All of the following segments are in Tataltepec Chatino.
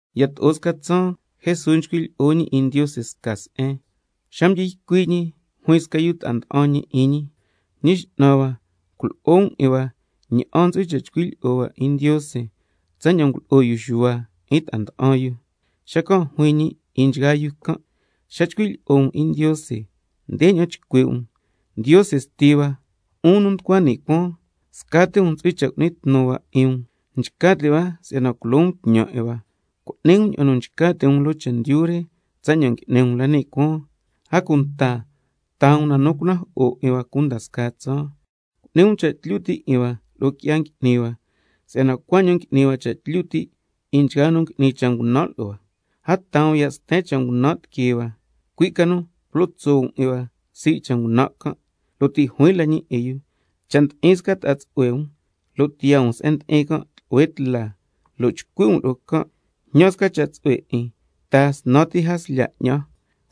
Yato'o sca tsaan Jesús nchcui' lyi'o ñi 'in Ndiose sca se'en, xa mdyi ycui' ñi juin sca yu ta'a nda'an ñi lo'o ñi: Ñi X'nan hua, culo'o um 'in hua ña'an ntsu'hui cha' chcui' lyi'o hua 'in Ndiose, tsaña'an ngulo'o yu Xuhua 'in ta'a mda'an yu. Xacan' juin ñi 'in nchgaa yu can': Xa chcui' lyi'o um 'in Ndiose ndeña'an chcui' um: Ndiose Sti hua, 'un nu nducua ni' cuaan, scati um ntsu'hui cha' cu'ni tnu hua 'in um. Nchca ti' hua si'yana tsatlyu culo um tñan 'in hua. Cu'ni um ña'an nu nchca ti' um loo chendyu re tsaña'an ngui'ni um la ni' cuaan. A cunta taa um na nu cunajo'o 'in hua cunda scaa tsaan. Cu'ni um cha' tlyu ti' 'in hua lo'o qui'ya ngui'ni hua, si'yana cuaña'an ngui'ni hua cha' tlyu ti' 'in nchgaa nu ngui'ni cha' ngunan' lo'o hua. A taa um ya' sten cha' ngunan' tiquee hua, cui' ca nu culo tso' um 'in hua sii' cha' ngunan' can'. Lo' ti' juin la ñi 'in yu: Cha' ndi'in sca ta'a tsu'hue um, lo' tiyaa um se'en ndi'in can' tlu'hue tla, lo' chcui' um lo'o can': Jñan sca cha' tsu'hue 'in, taa snan ti jaslya 'ñan,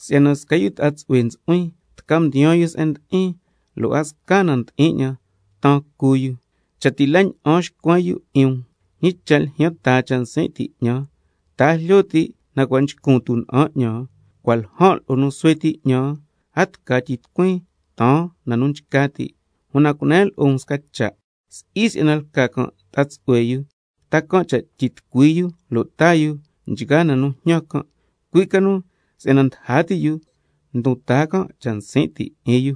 si'yana sca yu ta'a tsu'hue ntsu'huin tca mdiyaan yu se'en ndi'in, lo' a sca na ndi'in 'ñan taan cu yu. Cha' ti' la ña'an xcuen yu 'in um: Ñi cha' ljyan taa cha' nsin' ti' 'ñan, ta a jlyo ti' cua' nchcun tuna'an 'ñan, cua' ljan' lo'o nu xuhue ti 'ñan, a tca tyitucuin taan na nu nchca ti'. Una cunen lo'o um sca cha', si'i si'yana lca can' ta'a tsu'hue yu ta can' cha' tyitucui yu lo' taa yu nchgaa na nu njñan can', cui' ca nu si'yana ndaja ti yu ndon taa can' cha' nsin' ti' 'in yu.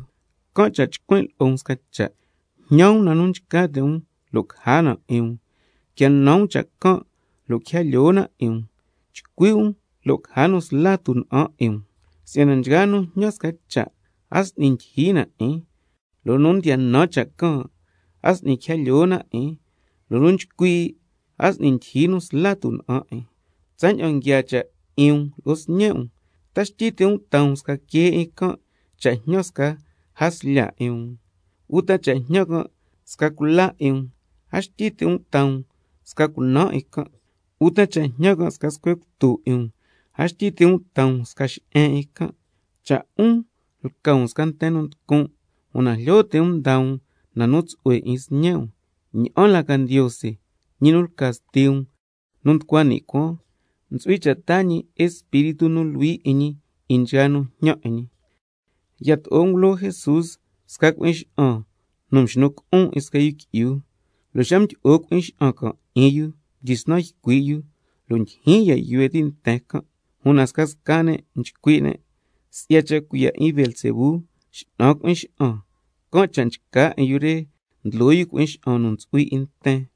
Can' cha' chcuin' lo'o um sca cha': Jñan um na nu nchca ti' um lo' caja na 'in um, quia nan um cha' can' lo' quija lyoo na 'in um, chcui' um lo' caja nu sla tuna'an 'in um. Si'yana nchgaa nu njñan sca cha', a s'ni ndyijyi na 'in, lo' nu ndiya nan cha' can', a s'ni quija lyoo na 'in, lo' nu nchcui', a s'ni ndyijyi nu sla tuna'an 'in. Tsaña'an nguiaa cha' 'in um lo'o sñe' um, ¿ta xtyi ti' um taa um sca quee 'in can' cha' na jñan sca jaslya 'in um? Uta cha' jñan can' sca cula 'in um, a xtyi ti' um taa um sca cunaan 'in can'. Uta cha' jñan can' sca scuhue cutu 'in um, a xtyi ti' um taa um sca xe'en 'in can'. Cha' 'un lca um sca nten nu nducun', una jlyo ti' um ndaa um na nu tsu'hue 'in sñe' um, ña'an la ca Ndiose, ñi nu lca Sti um nu nducua ni' cuaan, ntsu'hui cha' taa ñi Espíritu nu Luhui 'in ñi 'in nchgaa nu njñan 'in ñi. Yato'o ngulo Jesús sca cui'in xa'an nu cua' mxnu cu'un 'in sca yu qui'yu, lo' xa mdyi'o cui'in xa'an can' 'in yu mdyisnan ycui' yu, lo' ndyijyin ya' yuhue ti' nten can'. Una scasca ne' mdyisnan nchcui' ne': Si'ya cha' cuiya' 'in Beelzebú, x'nan cui'in xa'an, can' cha' nchca 'in yu re ndlo yu cui'in xa'an nu ntsu'hui 'in nten.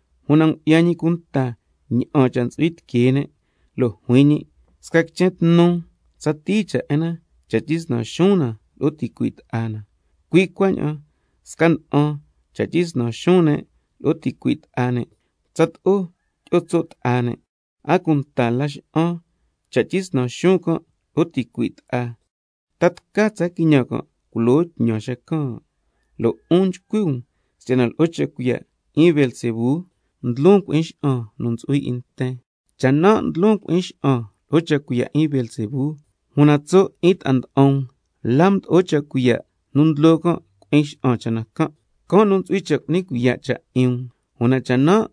Una ngu'ya ñi cunta ña'an cha' nu nda'an tiquee ne', lo' juin ñi: Sca quichen tnu tsatii cha' 'in na cha' tyisnan xuun na lo'o ticui' ta'a na, cui' cuaña'an sca na'an cha' tyisnan xuun ne' lo'o ticui' ta'a ne', tsato'o tyi'o tso' ta'a ne'. A cunta Laxa'an cha' tyisnan xuun can' lo'o ticui' ta'a, ¿ta tca tsa quiñan can' culo tñan xacan'? Lo' 'un nchcui' um si'yana lo'o cha' cuiya' 'in Beelzebú ndlon cui'in xa'an nu ntsu'hui 'in nten. Cha' nan' ndlon cui'in xa'an lo'o cha' cuiya' 'in Beelzebú, una tso' 'in ta'a nda'an um, ¿la mdo'o cha' cuiya' nu ndlo can' cui'in xa'an cha' na can'? Can' nu ntsu'hui cha' cu'ni cuiya' cha' 'in um. Una cha' nan'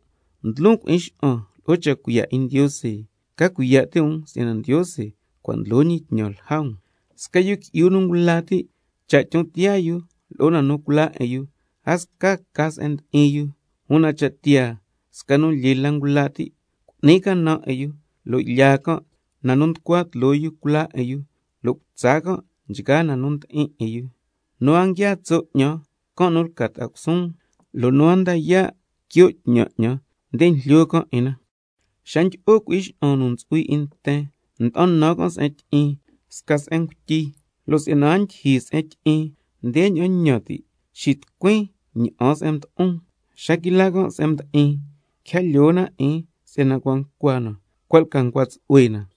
ndlon cui'in xa'an lo'o cha' cuiya' 'in Ndiose, ca cuiya' ti' um si'yana Ndiose cua' ndlo ñi tñan lja um. Sca yu qui'yu nu ngula ti', cha' tyon tiyaa yu lo'o na nu culaa 'in yu, a sca ca se'en ndi'in yu. Una cha' tiyaa sca nu lyee la ngula ti', cu'ni can' canan 'in yu lo' lyaa can' na nu nducua tloo yu culaa 'in yu, lo' cutsa can' nchgaa na nu ndi'in 'in yu. Nu a nguiaa tso' 'ñan, can' nu lca ta'a cusuun, lo' nu a nda yaa' quio' tñan 'ñan, nde njlyo can' 'in na. Xa ndyi'o cui'in xa'an nu ntsu'hui 'in nten, nda'an nan can' se'en tyi'in sca se'en ngutyi. Lo' si'yana a ndyijyi se'en tyi'in ndeña'an ñan ti': Xitucuin nde na'an se'en mdo'on. Xa quila can' se'en mdi'in, quija lyoo 'in na si'yana cua' ncua na, cua' lca ncua tsu'hue na.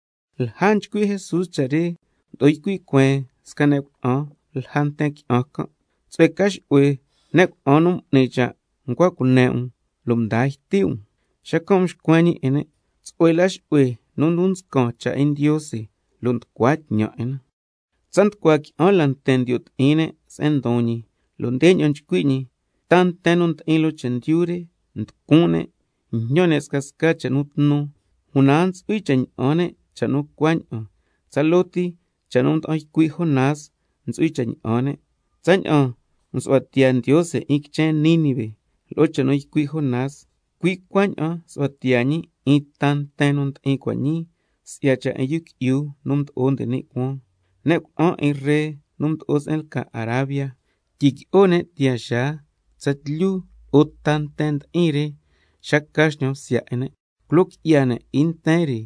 Lja nchcui' Jesús cha' re, mdo'o ycui' cueen sca ne' cuna'an lja nten qui'an can': Tsu'hue ca xu'hue ne' cuna'an nu m'ni cha' ncua cune' um, nu mdaa yti' um. Xacan' mxcuen ñi 'in ne': Tsu'hue la xu'hue nu ndon nscan cha' 'in Ndiose lo' nducua tñan 'in na. Tsa nducua qui'an la nten ndiyo' ti'in ne' se'en ndon ñi, lo' ndeña'an ycui' ñi: Ta nten nu ndi'in loo chendyu re nducun' ne', njñan ne' scasca cha' nu tnu, una a ntsu'hui cha' ña'an ne' cha' nu cuaña'an, tsaloo ti cha' nu mda'an ycui' Jonás ntsu'hui cha' ña'an ne'. Tsaña'an msu'hua tiyaa Ndiose 'in quichen Nínive lo'o cha' nu ycui' Jonás, cui' cuaña'an nsu'hua tiyaa ñi 'in ta nten nu ndi'in cua' ñii si'ya cha' 'in Yu Qui'yu nu Mdo'o nde ni' Cuaan. Ne' cuna'an 'in ree nu mdo'o se'en lca Arabia, tyiqui'o ne' tiyaa xaa tsatlyu lo'o ta nten ndi'in re xa ca xñan bsya 'in ne', culo qui'ya ne' 'in nten re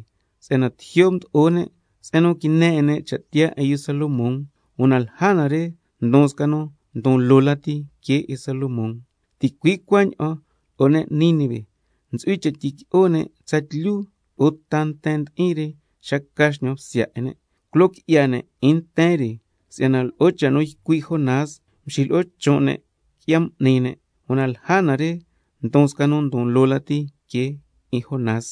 si'yana tijyo' mdo'o ne' se'en nu quine 'in ne' cha' tiyaa 'in yu Salomón, una lja na re ndon sca un ndon loo lati que 'in Salomón. Ticui' cuaña'an lo'o ne' Nínive, ntsu'hui cha' tyiqui'o ne' tsatlyu lo'o ta nten ndi'in re xa ca xñan bsya 'in ne', culo qui'ya ne' 'in nten re si'yana lo'o cha' nu ycui' Jonás mxilo'o chon' ne' qui'ya m'ni ne', una lja na re ndon sca nu ndon loo lati que 'in Jonás.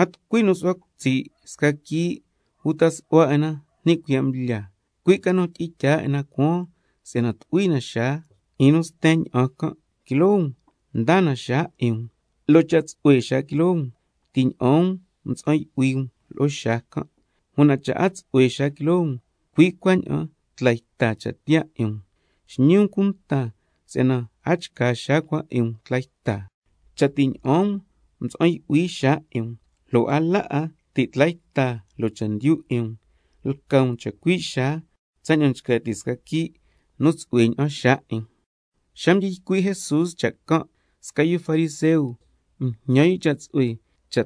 A tucui nu su'hua cutsi' sca quii' uta su'hua 'in na ni' cuiya' mblya, cui' ca nu tyi'in tyaa 'in na cuaan si'yana tu'hui na xaa 'in nu sten ña'an can'. Quiloo um ndaa na xaa 'in um, lo' cha' tsu'hue xaa quiloo um ti' ña'aan um mtsa'an yu'hui um lo'o xaa can', una cha' a tsu'hue xaa quiloo um, cui' cuaña'an tla yta cha' tiyaa 'in um. Xñi um cunta si'yana a chca xaa cua 'in um tla yta. Cha' ti' ña'aan um mtsa'an yu'hui um lo'o xaa, lo' a la 'a ti' tla yta loo chendyu 'in um, lca um chacui' xaa tsaña'an nchca ti' sca quii' nu tsu'hue ña'an xaa 'in. Xa mdyi ycui' Jesús cha' can', sca yu fariseo mjñan yu cha' tsu'hue cha'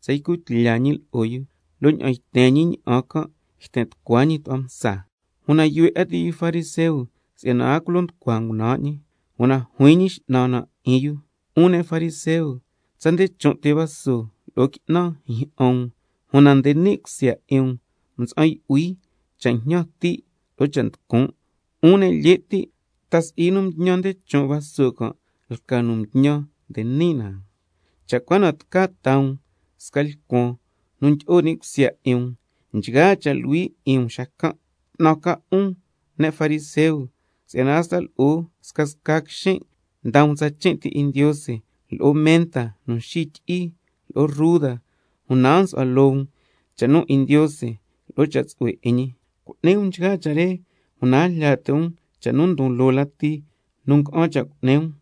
tsa ycu tlya ñi lo'o yu, lo' ña'aan yten ñi ña'an can' yten tucua ñi tu'hua msa. Una yuhue 'a ti' yu fariseo si'yana a culo nducua ngunan' ñi. Una juin Ñi X'nan na 'in yu: 'Un ne' fariseo, tsa nde chon' ti vaso lo'o qui'nan njyi'an um, una nde ni' cusya 'in um mtsa'an yu'hui cha' jñan ti' lo'o cha' nducun'. 'Un ne' lye' ti', ¿ta si'i nu mtñan nde chon' vaso can' lca nu mtñan nde ni' na? Cha' cua na tca taa um sca lcuan nu tyi'o ni' cusya 'in um, nchgaa cha' luhui 'in um xacan'. 'Tnan ca um, 'un ne' fariseo, si'yana hasta lo'o scasca na quixin' ndaa um tsachin' ti 'in Ndiose, lo'o menta nu xityi'i, lo'o ruda, una a nsu'hua loo um cha' nu ñi 'in Ndiose lo'o cha' tsu'hue 'in ñi. Cu'ni um nchgaa cha' re, una a jlya ti' um cha' nu ndon loo lati nu nga'an cha' cu'ni um.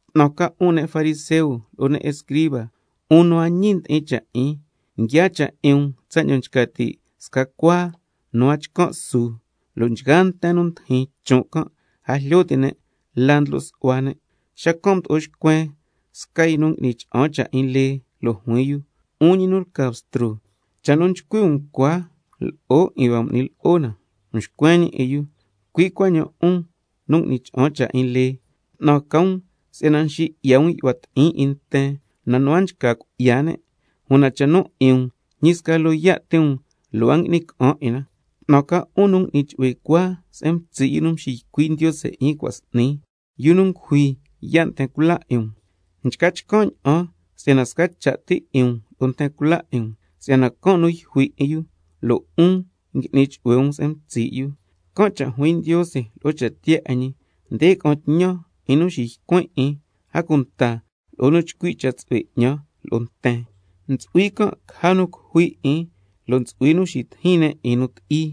'Tnan ca 'un ne' fariseo lo'o ne' escriba, 'un nu a ñi ndi'in cha' 'in, nguiaa cha' 'in um tsaña'an nchca ti' sca cuaa nu a chcan' su, lo' nchgaa nten nu ndijin chon' can' a jlyo ti' ne' la ndlo' su'hua ne'. Xacan' mdo'o xcuen sca yu nu ngui'ni cha'an cha' 'in lee, lo' juin yu: 'Un ñi nu lca Bstro, cha' nu nchcui' um cua lo'o 'in hua m'ni lo'o na. Mxcuen ñi 'in yu: Cui' cuaña'an 'un nu ngui'ni cha'an cha' 'in lee, 'tnan ca um, si'yana nxi 'ya um yu'hua ti'in 'in nten nu a nchca cui'ya ne', una cha' nu 'in um, ñi sca loyaa' ti um lo' a ngui'ni ca'an 'in na. 'Tnan ca 'un nu ngui'ni chu'hue cuaa se'en mtsi' yu nu mxiycui' Ndiose 'in cua' s'ni, yu nu ngujui yaa' nten cula 'in um. Nchca chcan' ña'an si'yana sca cha' ti 'in um lo'o nten cula 'in um, si'yana can' nu yjui 'in yu, lo' 'un ngui'ni chu'hue um se'en mtsi' yu. Can' cha' juin Ndiose lo'o cha' tiyaa 'in ñi: Nde ca'an tñan 'in nu xiycuin' 'in, a cunta lo'o nu chcui' cha' tsu'hue 'ñan lo'o nten, ntsu'hui can' caja nu cujui 'in lo' ntsu'hui nu xitijin ne' 'in nu ti'i,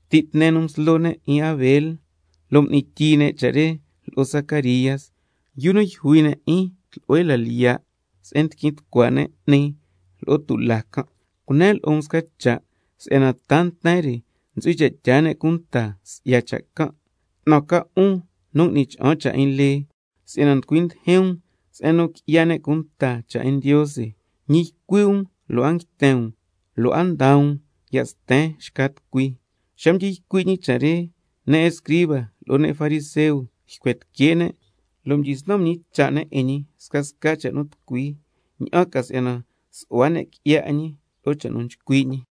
ti' tne nu mslo ne' 'in Abel lo' m'ni tyii ne' cha' re lo'o Zacaría, yu nu yjui ne' 'in tlu'hue la lyiya' se'en ndiquin tucua 'ni lo'o tulaa can'. Cunen lo'o um sca cha' si'yana ta nten re ntsu'hui cha' tyaa ne' cunta si'ya cha' can'. 'Tnan ca 'un nu ngui'ni cha'an cha' 'in lee, si'yana nducui ndijin um se'en nu qui'ya ne' cunta cha' 'in Ndiose, ñi ycui' um lo' a nguiten um, lo' a ndaa um ya' sten xca tucui. Xa mdyi ycui' ñi cha' re, ne' escriba lo'o ne' fariseo ycuen tique' ne' lo' mdyisnan mñicha' ne' 'in ñi scasca cha' nu tucui, ña'an ca si'yana su'hua ne' qui'ya 'in ñi lo'o cha' nu chcui' ñi.